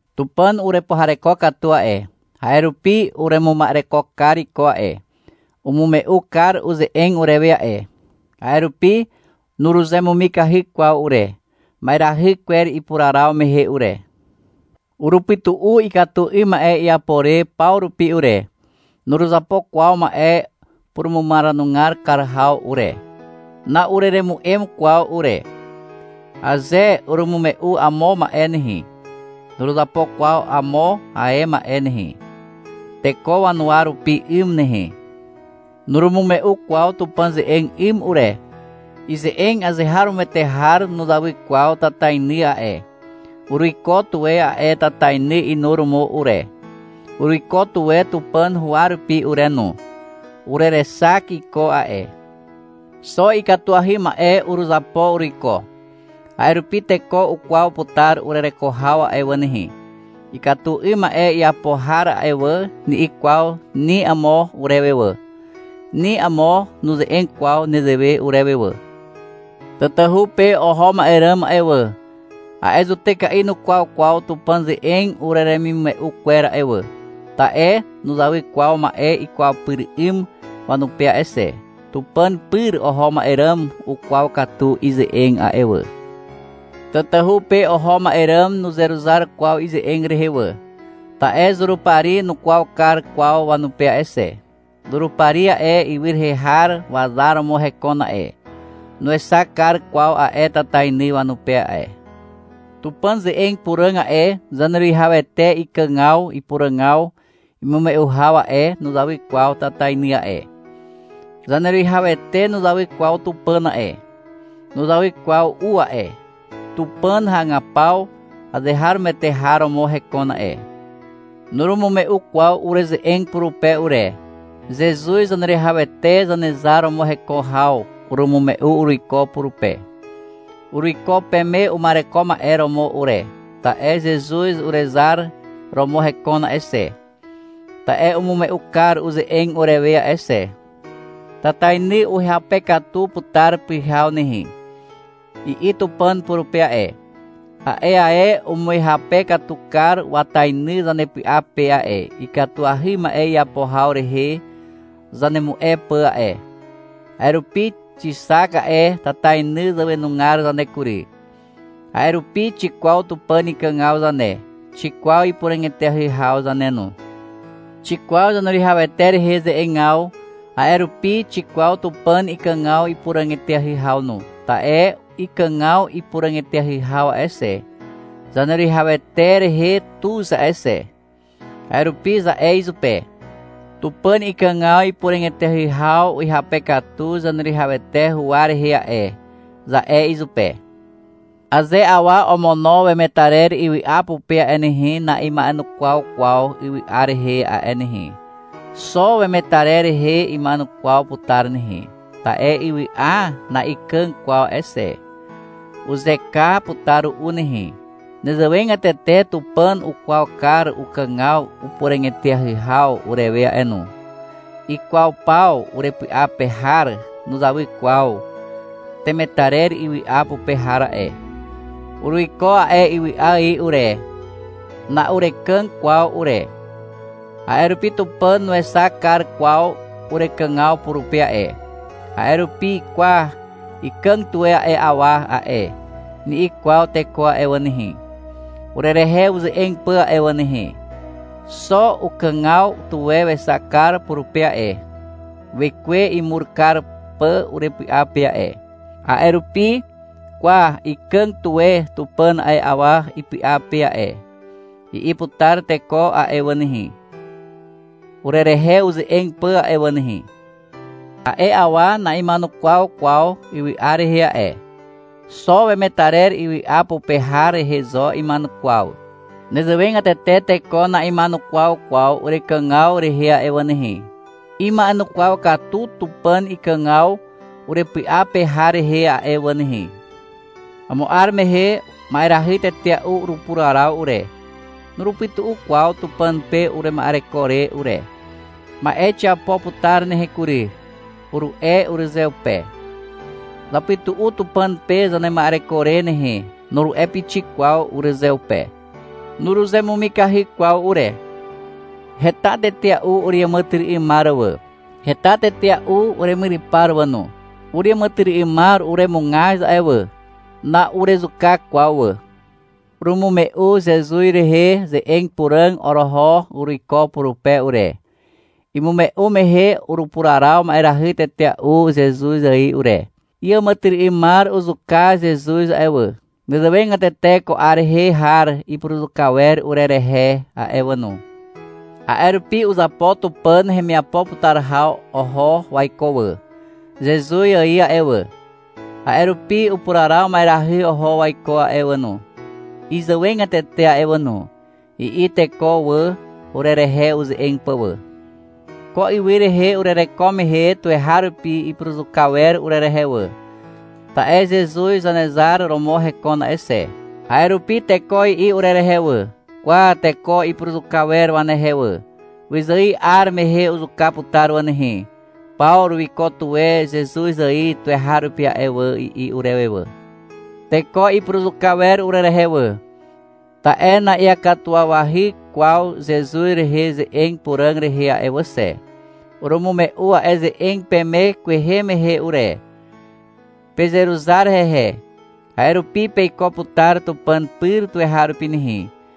Tupàn urepuhareko katu a'e, a'e rupi uremuma'ereko kar iko a'e, umume'u kar uze'eg urewe a'e. A'e rupi nuruzemumikahy kwaw ure, ma'erahy kwer ipuraraw mehe ure. Urupytu'u ikatu 'ym ma'e iapo re paw rupi ure. Nuruzapo kwaw ma'e purumumaranugar kar haw ure. Nuruzapo kwaw ikatu 'ym ma'e teko wanuwa rupi 'ym. Na'ureremu'em kwaw ure. Aze urumume'u amo ma'e nehe, nuruzapo kwaw amo ae ma'e nehe, teko wanuwa rupi 'ym nehe. Nurumume'u kwaw Tupàn ze'eg 'ym ure. Ize'eg azeharomoete har nuzawy kwaw tatainy a'e. Uruiko tuwe a'e tatainy inuromo ure. Uruiko tuwe Tupàn huwa rupi ure no. Urerexak iko a'e. Xo ikatuahy ma'e uruzapo uruiko. A'e rupi teko ukwaw putar urereko haw a'e wà nehe. — Ikatu 'ym ma'e iapo har a'e wà, ni'i kwaw ni amo urewe wà. Ni amo nuze'eg kwaw nezewe urewe wà. Tatahu pe oho ma'e ràm a'e wà, a'e zutyka'i nukwaw kwaw Tupàn ze'eg ureremimume'u kwer a'e wà. Ta'e nuzawy kwaw ma'e ikwaw pyr 'ym wanupe a'e xe. Tupàn pyr oho ma'e ràm ukwaw katu ize'eg a'e wà. Tatahu pe oho ma'e ràm nuzeruzar kwaw ize'eg rehe wà, ta'e Zurupari nukwaw kar kwaw wanupe a'e xe. Zurupari a'e, ywy rehe har wazar romo hekon a'e. Nuexak kar kwaw a'e tatainy wanupe a'e. Tupàn ze'eg puràg a'e, Zaneruwihawete ikàgaw ipuràgaw imume'u haw a'e, nuzawy kwaw tatainy a'e. Zaneruwihawete nuzawy kwaw Tupàn a'e. (Nuzawy kwaw u a'e.) Tupàn hagapaw azeharomoete har romo hekon a'e. Nurumume'u kwaw ureze'eg purupe ure. Zezuz Zaneruwihawete Zanezar romo heko haw urumume'u uruiko purupe. Uruiko peme uma'ereko ma'e romo ure, ta'e Zezuz urezar romo hekon a'e xe, ta'e umume'u kar uze'eg urewe a'e xe. — Tatainy uhyape katu putar pyhaw nehe, i'i Tupàn purupe a'e. A'e ae umuhyape katu kar watainy zanepy'a pe a'e, ikatuahy ma'e iapo haw rehe zanemu'e pà a'e. A'e rupi xixak a'e tatainy zàwenugar zane kury. A'e rupi xikwaw Tupàn ikàgaw zane, xikwaw ipuràg eteahy haw zane no. Xikwaw Zaneruwihawete rehe ze'egaw, a'e rupi xikwaw Tupàn ikàgaw ipuràg eteahy haw no, ta'e ikàgaw ipuràg eteahy haw a'e xe, Zaneruwihawete rehe tuz a'e xe. A'e rupi za'e izupe, — Tupàn ikàgaw ipuràg eteahy haw uhyape katu Zaneruwihawete huwa rehe a'e, za'e izupe. Aze awa omono wemetarer ywy'a pupe a'e nehe, na'ima'enukwaw kwaw ywy'a rehe a'e nehe. Xo wemetarer rehe ima'enukwaw putar nehe. Ta'e ywy'a na'ikàg kwaw a'e xe. Uzeka putar ru'u nehe. Nezewegatete Tupàn ukwaw kar ukàgaw upuràg eteahy haw urewe a'e no. Ikwaw paw urepy'a pe har nuzawy kwaw temetarer ywy'a pupe har a'e. Uruiko a'e ywy'a ài ure. Na'urekàg kwaw ure. A'e rupi Tupàn nuexak kar kwaw urekàgaw purupe a'e. A'e rupi — Kwa, ikàg tuwe a'e awa a'e, ni'i kwaw teko a'e wà nehe, urerehe uze'eg pà a'e wà nehe. Xo ukàgaw tuwe wexak kar purupe a'e, Wekwe imur kar pà urepy'a pe a'e. A'e rupi, — Kwa, ikàg tuwe Tupàn a'e awa ipy'a pe a'e, i'i putar teko a'e wà nehe, urerehe uze'eg pà a'e wà nehe. A'e awa na'ima'enukwaw kwaw ywy'a rehe a'e. Xo wemetarer ywy'a pupe har rehe zo ima'enukwaw. Nezewegatete teko na'ima'enukwaw kwaw urekàgaw rehe a'e wà nehe. Ima'enukwaw katu Tupàn ikàgaw urepy'a pe har rehe a'e wà nehe. Amo 'ar mehe ma'erahy tetea'u urupuraraw ure, nurupytu'u kwaw Tupàn pe urema'ereko re ure. — Ma'e xiapo putar nehe kury, uru'e urezeupe. — Zapytu'u Tupàn pe zanema'ereko re nehe, nuru'e pixik kwaw urezeupe. Nuruzemumikahy kwaw ure. Heta tetea'u ureàmàtyry'ymar wà. Heta tetea'u uremyrypar wà no. Ureàmàtyry'ymar uremugaz a'e wà. Na'urezuka kwaw wà. Urumume'u Zezuz rehe ze'eg puràg oroho uruiko purupe ure. Imume'u mehe urupuraraw ma'erahy tetea'u Zezuz ài ure. Iàmàtyry'ymar uzuka Zezuz a'e wà. Nezewegatete ko 'ar rehe har ipuruzuka wer urerehe a'e wà no. A'e rupi — Uzapo Tupàn hemiapo putar haw oho waiko wà, Zezuz ài a'e wà, a'e rupi upuraraw ma'erahy oho waiko a'e wà no, izàwegatete a'e wà no, i'i teko wà, urerehe uze'eg pà wà. Ko ywy rehe urereko mehe tuweharupi ipuruzuka wer urerehe wà, ta'e Zezuz Zanezar romo hekon a'e xe. A'e rupi teko i'i urerehe wà. — Kwa teko ipuruzuka wer wanehe wà. Wyzài 'ar mehe uzuka putar wà nehe. Pawru wiko tuwe Zezuz ài tuweharupi a'e wà, i'i urewe wà. Teko ipuruzuka wer urerehe wà, ta'e na'iakatuwawahy kwaw Zezuz rehe ze'eg puràg rehe a'e wà xe. Urumume'u a'e ze'eg peme kwehe mehe ure. Pezeruzar hehe, a'e rupi peiko putar Tupàn pyr tuweharupi nehe.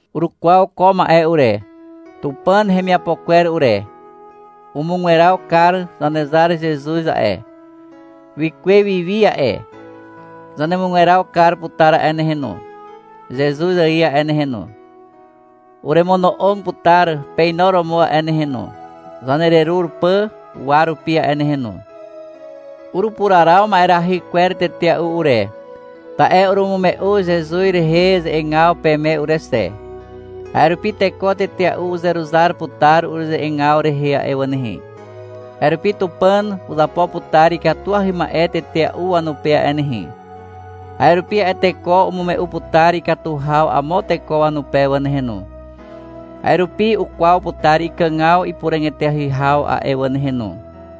Urukwaw ko ma'e ure, Tupàn hemiapo kwer ure. Umugweraw kar Zanezar Zezuz a'e. Wikuwe wi wi a'e. Zanemugweraw kar putar a'e nehe no, Zezuz ài a'e nehe no. Uremono'og putar peinuromo a'e nehe no, zanererur pà uwa rupi a'e nehe no. Urupuraraw ma'erahy kwer tetea'u ure, ta'e urumume'u Zezuz rehe ze'egaw peme ure xe. A'e rupi teko tetea'u uzeruzar putar ureze'egaw rehe a'e wà nehe. A'e rupi Tupàn uzapo putar ikatuahy ma'e tetea'u wanupe a'e nehe. A'e rupi a'e teko umume'u putar ikatu haw amo teko wanupe wà nehe no. A'e rupi ukwaw putar ikàgaw ipuràg eteahy haw a'e wà nehe no.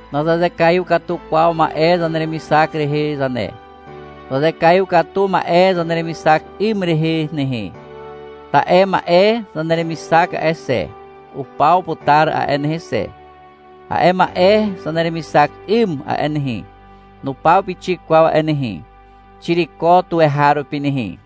Nazazekaiw katu kwaw ma'e zaneremixak rehe zane. Zazekaiw katu ma'e zaneremixak 'ym rehe nehe. Ta'e ma'e zaneremixak a'e xe, upaw putar a'e nehe xe. A'e ma'e zaneremixak 'ym a'e nehe, nupaw pixik kwaw a'e nehe. Xiriko tuweharupi nehe.